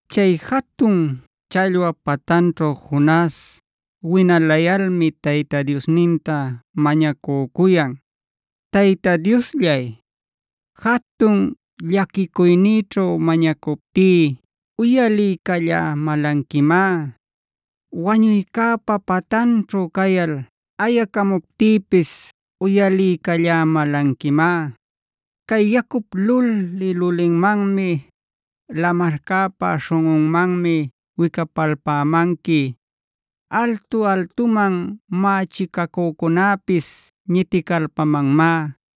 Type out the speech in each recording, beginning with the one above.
Chay jatun challwap patanćhu Jonas winalayalmi Tayta Diosninta mañacücuyan: “Tayta Diosllay, jatun llaquicuynïćhu mañacuptí uyaliycallämälanquimá.a Wañuycäpa patanćhu cayal ayacamuptïpis uyaliycallämälanquimá. Cay yacup luli-lulinmanmi, lamarcäpa śhunꞌunmanmi wicapalpämanqui. Altu-altuman mächicacücunäpis ñiticalpamanmá,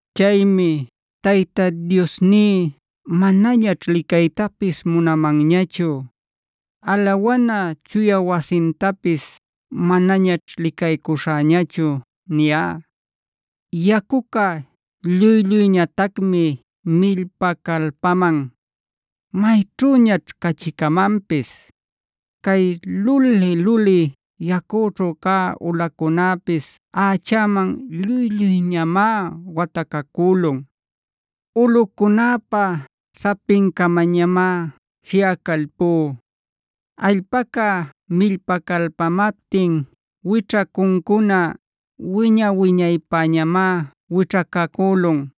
Chaymi ‘Tayta Diosní manañaćh licaytapis munamanñachu;c alawana chuya wasintapis manañaćh licaycuśhäñachu’ niyá. “Yacucá lluy-lluyñatacmi millpacalpaman. ¿Mayćhüñaćh cachicamanpis? Cay luli-luli yacućhu cä ulacunäpis ächäman lluy-lluyñamá watacacülun. Ulꞌucunäpa sapincamañamá jiꞌacalpú.d Allpaca millpacalpamaptin wićhacuncuna wiña-wiñaypäñamá wićhacacülun.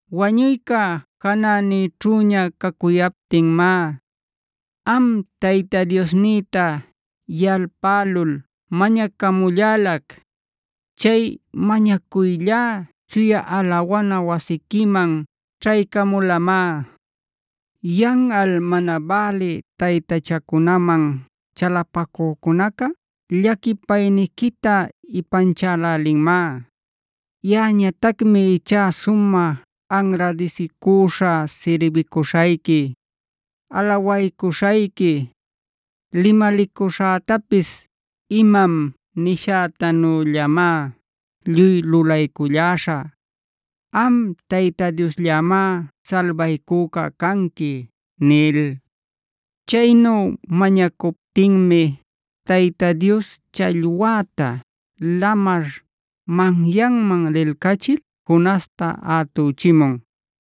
Wañuyca janänïćhüña cacuyaptinmá, am Tayta Diosnïta yalpälul mañacamullalac. Chay mañacuyllá chuya alawana wasiquiman ćhaycamulamá. Yanꞌal mana bälï taytachacunaman chalapacücunacá llaquipayniquita ipanchälälinmá. Yaꞌañatacmi ichá sumä anradisicüśhä sirbicuśhayqui, alawaycuśhayqui. Limalicuśhätapis imam nishätanüllamá lluy lulayculläśhä.f Am Tayta Diosllämá salbaycüca canqui” nil. Chaynu mañacuptinmi Tayta Dios challwäta lamar manyanman lilcachil Jonasta ätüchimun.